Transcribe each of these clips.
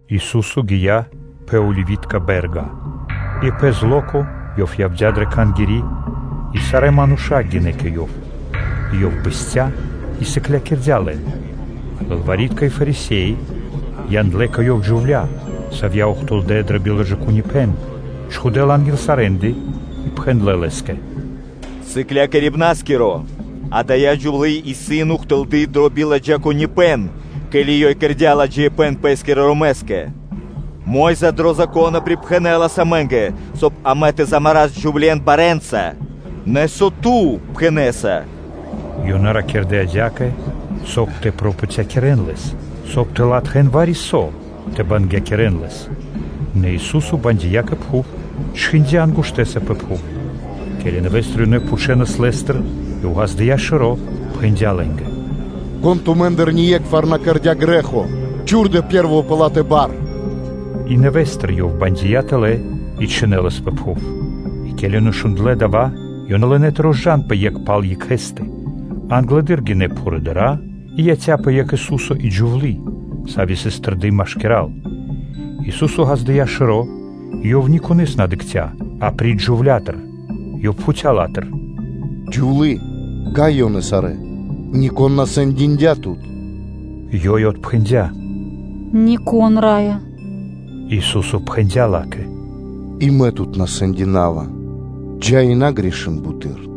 Ису́со гия́ пэ Оливи́тко бэ́рга. И пэ зло́ко Ёв явдя́ дрэ Кхангири́, и сарэ́ мануша́ гинэ́ кэ Ёв; и Ёв бэсця́ и сыклякирдя́ лэн. Лылвари́тка и Фарисе́и яндлэ́ кэ Ёв джувля́, савья́ ухтылдэ́ дро биладжаипэ́н, чхудэ́ ла анги́л сарэ́ндэ, и пхэндлэ́ Лэ́скэ: “Сыклякирибна́скиро! Адая джувлы́ исын ухтылды дро биладжаипэ́н; ке́ли ёй кэрдя́ ладжаипэ́н пэ́скирэ ромэскэ. Мо́йза дрэ Зако́но припхэнэлас амэ́нгэ, соб (кай) амэ тэ замарас джувле́н барэ́нца; нэ со Ту пхэнэ́са?” Ёнэ ракирдэ́ адя́кэ, соб (кай) тэ пропатякирэн Лэс, соб (кай) тэ латхэ́н вари-со тэ бангякирэн Лэс. Нэ Ису́со бандия кэ пхув, чхиндя́ ангуштэса пэ пхув? Ке́ли нэвэ́стыр Ёнэ пхучэнас Лэ́стыр, Ёв ґаздыя́ шэро́, пхэндя́ лэ́нгэ: “Кон тумэ́ндыр ние́кхвар на кэрдя́ грэ́хо, чхурдэ пэ́рво пэ ла́тэ бар.” И нэвэ́стыр Ёв бандия тэлэ́ и чхинэлас пэ пхув. И ке́ли ёнэ шундлэ́ дава́, ёнэ лынэ́ тэ розджанпэ екх пал екхэ́стэ, англэды́р гинэ́ пхурыдыра́; и яця́пэ екх Ису́со и джувлы́, сави́ сыс тэрды машкира́л. Ису́со ґаздыя́ шэро́, и Ёв ни конэ́с на дыкхця́ апри́ч джувля́тэ; Ёв пхуця́ ла́тыр: “Джувлие! Кай исын ёнэ сарэ́? Нико́н на сэндиндя тут?” Ёй отпхэндя́: “Нико́н, Раё!” Ису́со пхэндя́ ла́кэ: “И Мэ тут на сэндинава; джа́ и на кэр грэ́хи буты́р.”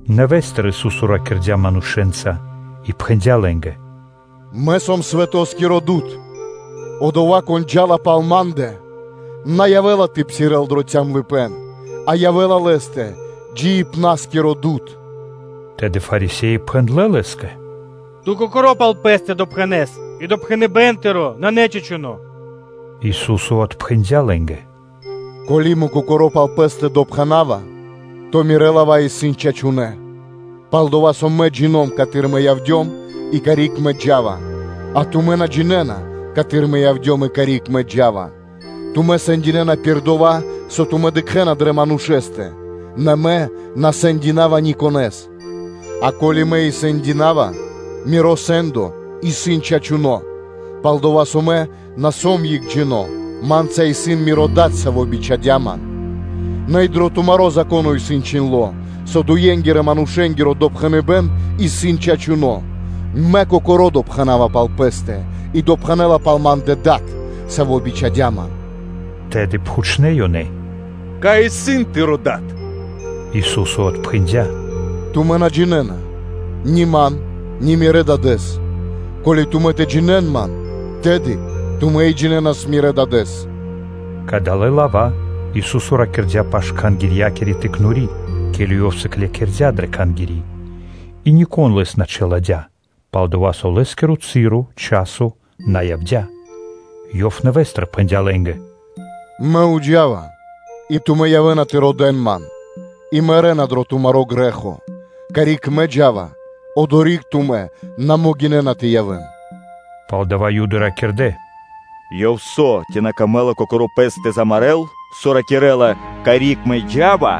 Нэвэ́стыр Ису́со ракирдя́ манушэ́нца и пхэндя́ лэ́нгэ: “Мэ сом дуд дро дава́ свэ́то: одова́, кон джа́ла пал Ма́ндэ, на явэ́ла тэ псирэ́л дро калыпэ́н, а явэ́ла лэ́стэ джиибна́скиро дуд.” Тэды Фарисе́и пхэндлэ́ Лэ́скэ: “Ту Кокоро́ пал Пэ́стэ допхэнэса, и допхэныбэ́н Тыро́ исын на чачуно́.” Ису́со отпхэндя́ лэ́нгэ: “Ко́ли Мэ Кокоро́ пал Пэ́стэ допхэнава, то Мирэ́ лава́ исын чачунэ́, пал-дова́ со Мэ джино́м, каты́р Мэ явдём и карик Мэ джа́ва; а тумэ́ на джинэ́на, каты́р Мэ явдём и карик Мэ джа́ва. Тумэ́ сэндинэна пир дова́, со тумэ́ дыкхэ́на дрэ манушэ́стэ, нэ Мэ на сэндинава никонэ́с. А ко́ли Мэ и сэндинава, Миро сэ́ндо исын чачуно́, пал-дова́ со Мэ на сом екхджино́; Ма́нца исын Миро Дад, Саво́ бичхадя́ Ман. Нэ и дро тумаро́ Зако́но исын чхиндло́, со дуенгирэ-манушэ́нгиро допхэныбэ́н исын чачуно́: Мэ Кокоро́ допхэнава пал Пэ́стэ, и допхэнэ́ла пал Ма́ндэ Дад, Саво́ бичхадя́ Ман.” Тэды пхучнэ́ ёнэ: “Кай исын Тыро́ Дад?” Ису́со отпхэндя́: “Тумэ́ на джинэ́на ни Ман, ни Мирэ́ Дадэ́с; ко́ли тумэ́ тэ джинэ́н Ман, тэды тумэ́ и джинэнас Мирэ́ Дадэ́с.” Кадалэ́ лава́ Ису́со ракирдя́ пашы́л Кхангирья́кири пиралы́ (тыкнори́), ке́ли Ёв сыклякирдя́ дрэ Кхангири́; и нико́н Лэс на чиладя́, пал-дова́ со Лэ́скиро часо на явдя́. Ёв нэвэ́стыр пхэндя́ лэ́нгэ: “Мэ джа́ва, и тумэ́ явэ́на тэ родэ́н Ман, и мэрэ́на дрэ тумаро́ грэ́хо; карик Мэ джа́ва, одори́к тумэ́ на могинэ́на тэ явэ́н.” Палдава́ Юды ракирдэ́: “Ёв со, ци на камэ́ла Кокоро́ Пэс тэ замарэ́л, со ракирэ́ла: ‘Карик Мэ джа́ва,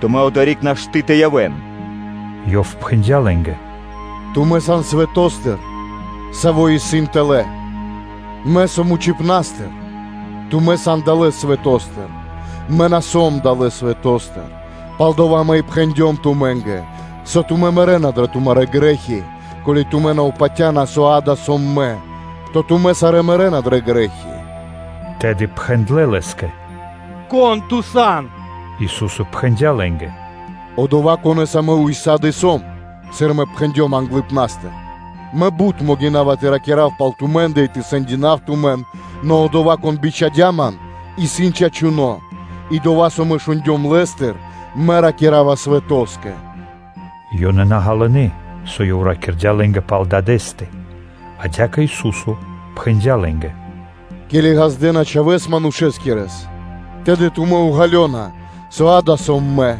тумэ́нгэ одори́к нашты́ тэ явэ́н?’” Ёв пхэндя́ лэ́нгэ: “Тумэ́ сан далэ́ свэто́стыр, саво́ исын тэла́л; Мэ сом вучипна́стыр; тумэ́ сан далэ́ свэто́стыр, Мэ на сом далэ́ свэто́стыр; палдова́ Мэ и пхэндём тумэ́нгэ, со тумэ́ мэрэ́на дрэ тумарэ́ грэ́хи; ко́ли тумэ́ на упатяна, со дава́ сом Мэ, то тумэ́ сарэ́ мэрэ́на дрэ грэ́хи!” Тэды пхэндлэ́ Лэ́скэ: “Кон Ту сан? Ису́со пхэндя́ лэ́нгэ: “Одова́, Конэса Мэ ўса́ды (сак) сом, сыр Мэ пхэндём англыпна́стыр; Мэ бут могина́ва тэ ракира́в пал тумэ́ндэ и тэ сэндинав тумэн; нэ Одова́, Кон бичхадя́ Ман, исын чачуно́ и дова́, со Мэ шундём Лэ́стыр, Мэ ракира́ва свэтоскэ.” Ёнэ на ґалынэ́, со Ёв ракирдя́ лэ́нгэ пал Дадэ́стэ. Адя́кэ Ису́со пхэндя́ лэ́нгэ: “Ке́ли ґаздэ́на Чхавэ́с Манушэскирэс, тэды тумэ́ уґалёна, со дава́ сом Мэ,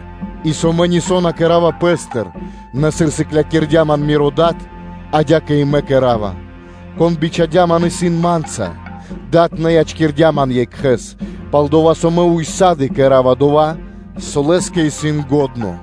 и со Мэ нисо́ на кэра́ва Пэ́стыр; нэ, сыр сыклякирдя́ Ман Миро Дад, адя́кэ и Мэ ракира́ва. Кон бичхадя́ Ман, исын Ма́нца; Дад на ячкирдя́ Ман екхэ́с, пал-дова́ со Мэ ўса́ды (сак) кэра́ва дова́, со Лэ́скэ исын лахчо.”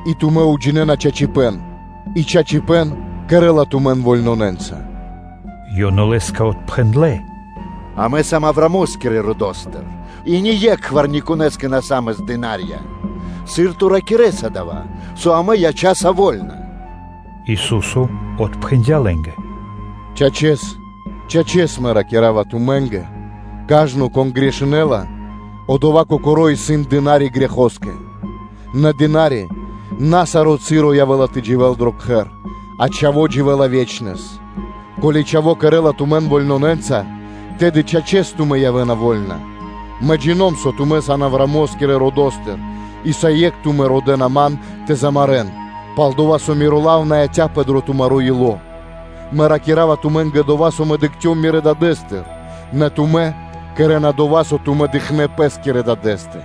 и тумэ́ уджинэна чачипэ́н, и чачипэ́н кэрэ́ла тумэн вольнонэнца. Ёнэ Лэ́скэ отпхэндлэ́: “Амэ сам Авраамо́скирэ родо́стыр и ние́кхвар никонэ́скэ на са́мас слу́ги (дына́рья); сыр Ту ракирэ́са дава́, со амэ ячаса вольна?” Ису́со отпхэндя́ лэ́нгэ: “Чачэс, чачэс, Мэ ракира́ва тумэ́нгэ: кажно, кон кэрэ́ла грэ́хо, одова́ кокоро́ исын дына́ри грэхоскэ. Нэ дына́ри на саро́ часо явэ́ла тэ дживэ́л дро кхэр; а чхаво́ дживэ́ла ве́чнэс. Ко́ли Чхаво́ кэрэ́ла тумэн вольнонэнца, тэды, чачэс, тумэ́ явэ́на вольна. Мэ джино́м (джина́в), со тумэ́ сан Авраамо́скирэ родо́стыр: и усае́кх тумэ́ родэ́на Ман тэ замарэ́н, пал-дова́ со Миро лав на яця́пэ дро тумаро́ ило́. Мэ ракира́ва тумэ́нгэ дова́, со Мэ дыкхцём Мирэ́ Дадэ́стэ: нэ тумэ́ кэрэ́на дова́, со тумэ́ дыкхнэ́ пэ́скирэ дадэ́стэ.”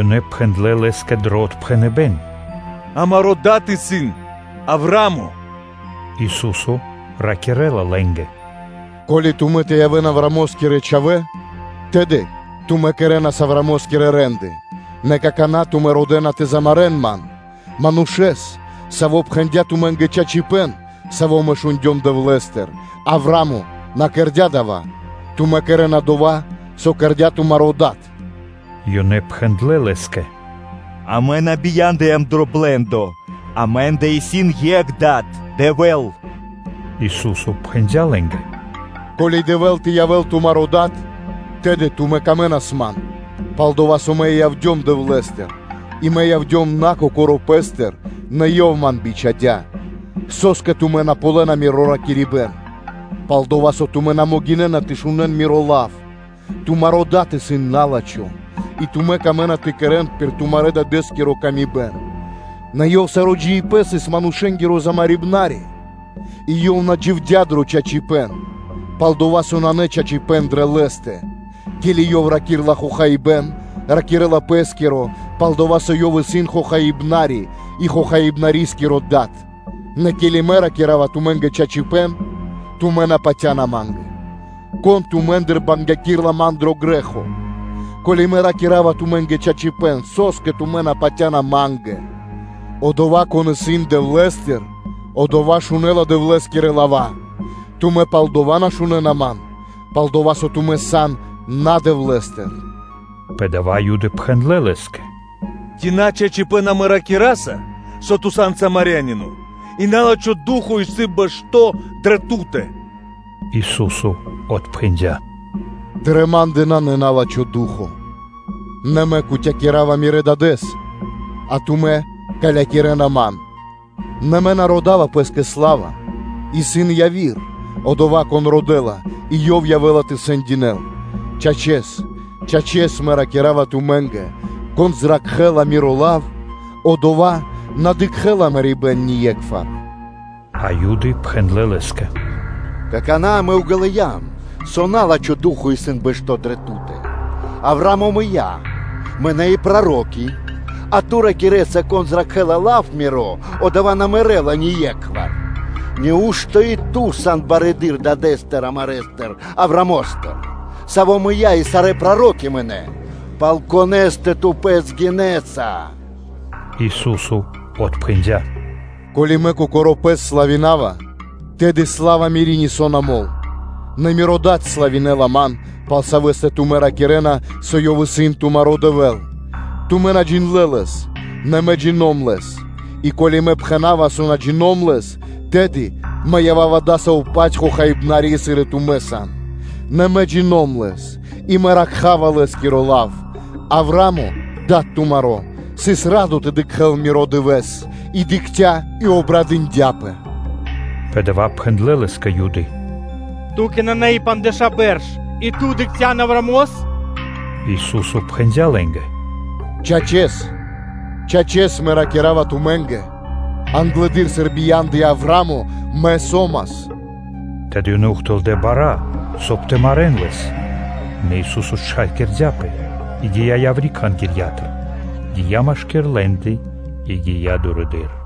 Ёнэ пхэндлэ́ Лэ́скэ дро отпхэныбэ́н: “Амаро́ дад исын Авраа́мо.” Ису́со ракирэ́ла лэ́нгэ: “Ко́ли тумэ́ тэ явэ́н Авраамо́скирэ чхавэ́, тэды тумэ́ кэрэ́нас Авраамо́скирэ рэ́нды; нэ какана́ тумэ́ родэ́на тэ замарэ́н Ман, Манушэ́с, Саво́ пхэндя́ тумэ́нгэ чачипэ́н, Саво́ Мэ шундём Дэвлэ́стыр; Авраа́мо на кэрдя́ дава́. Тумэ́ кэрэ́на дова́, со кэрдя́ тумаро́ дад.” Ёнэ пхэндлэ́ Лэ́скэ: “Амэ на бияндыям блэндостыр; амэ́ндэ исын екх Дад: Дэвэ́л.” Ису́со пхэндя́ лэ́нгэ: “Ко́ли Дэвэ́л тэ явэ́л тумаро́ Дад, тэды тумэ́нгэ явавас бы дро́го Мэ, пал-дова́ со Мэ и явдём Дэвлэ́стыр и Мэ явдём на Кокоро́ Пэ́стыр, нэ Ёв Ман бичхадя́. Со́скэ тумэ́ на ґалёна Миро ракирибэ́н? Пал-дова́ со тумэ́ на могинэ́на тэ шунэ́н Миро лав. Тумаро дад исын на́лачхо и тумэ́ камэ́на тэ кэрэ́н пир тумарэ́-дадэ́скири ла́ска. Нэ ёв саро́ джиибэ́н сыс манушэ́нгиро замарибнари, и ёв на дживдя́ дро чачипэ́н, пал-дова́ со нанэ чачипэ́н дрэ лэ́стэ; ке́ли ёв ракирэ́ла хохаибэ́н, ракирэ́ла пэ́скиро, пал-дова́ со ёв исын хохаибнари и хохаибнаскиро дад. Нэ ке́ли Мэ ракира́ва тумэ́нгэ чачипэ́н, тумэ́ на патя́на Ма́нгэ. Кон тумэ́ндыр бангякирэла Ман дро грэ́хо? Ко́ли Мэ ракира́ва тумэ́нгэ чачипэ́н, со́скэ тумэ́ на патя́на Ма́нгэ? Одова́, кон исын Дэвлэ́стыр, одова́ шунэ́ла Дэвлэ́скирэ лава́; тумэ́ палдава́ на шунэ́на, пал-дова́ со тумэ́ сан на Дэвлэ́стыр.” Пэ дава́ Юды пхэндлэ́ Лэ́скэ: “Ци на чачипэ́н амэ ракираса, со Ту сан Самарянино и на́лачхо ду́хо (фа́но) исын бэшто́ дрэ Ту́тэ?” Ису́со отпхэндя́: “Дрэ Ма́ндэ нанэ на́лачхо ду́хо (фа́но), нэ Мэ кутякирава Мирэ́ Дадэ́с, а тумэ́ калякирэна Ман. Нэ Мэ на родава Пэ́скэ сла́ва: исын яви́р, Одова́, Кон родэ́ла и Ёв явэ́ла тэ сэндинэл. Чачэс, Чачэс Мэ ракира́ва тумэ́нгэ: кон зракхэ́ла Миро лав, одова́ на дыкхэ́ла мэрибэ́н ние́кхвар.” А Юды пхэндлэ́ Лэ́скэ: “Какана́ амэ уґалыям, со на́лачхо ду́хо (фа́но) исын бэшто́ дрэ Ту́тэ; Авраа́мо мыя́, мынэ́ и проро́ки, а Ту ракирэ́са: ‘Кон зракхэ́ла лав Миро, одова́ на мэрэ́ла ние́кхвар’. Нау́што Ту сан барэды́р дадэ́стыр амарэстыр Авраамостыр, саво́ мыя́ и сарэ́ проро́ки мынэ́: пал конэ́стэ Ту Пэс гинэса?” Ису́со отпхэндя́: “Ко́ли Мэ Кокоро́ Пэс славинава, тэды сла́ва Мири́ нисо́ на мол: нэ Миро Дад славинэла Ман, пал Савэ́стэ тумэ́ ракирэ́на, со Ёв исын тумаро́ Дэвэ́л. Тумэ́ на джиндлэ́ Лэс, нэ Мэ джино́м (джина́в) Лэс; и ко́ли Мэ пхэна́ва, со на джино́м Лэс, тэды Мэ ява́ва адасаво́-паць хохаибнари, сыр и тумэ́ сан. Нэ Мэ джино́м Лэс и Мэ ракхава Лэ́скиро лав. Авраа́мо, дад тумаро́, сыс радо тэ дыкхэ́л Миро дывэ́с: и дыкхця́, и обрадындяпэ.” Пэ дава́ пхэндлэ́ Лэ́скэ Юды: “Ту́кэ нанэ и пандждэша́ бэрш, и Ту дыкхця́н Авраамос?” Ису́со пхэндя́ лэ́нгэ: “Чачэс, чачэс Мэ ракира́ва тумэ́нгэ: англэды́р, сыр бия́ндыя Авраа́мо, Мэ со́мас.” Тэды ёнэ ухтылдэ́ бара́, соб (кай) тэ марэ́н Лэс; нэ Ису́со счхакирдяпэ и гия́ яври́ Кхангирья́тыр, гия́ машки́р лэ́ндэ, и гия́ дурэды́р.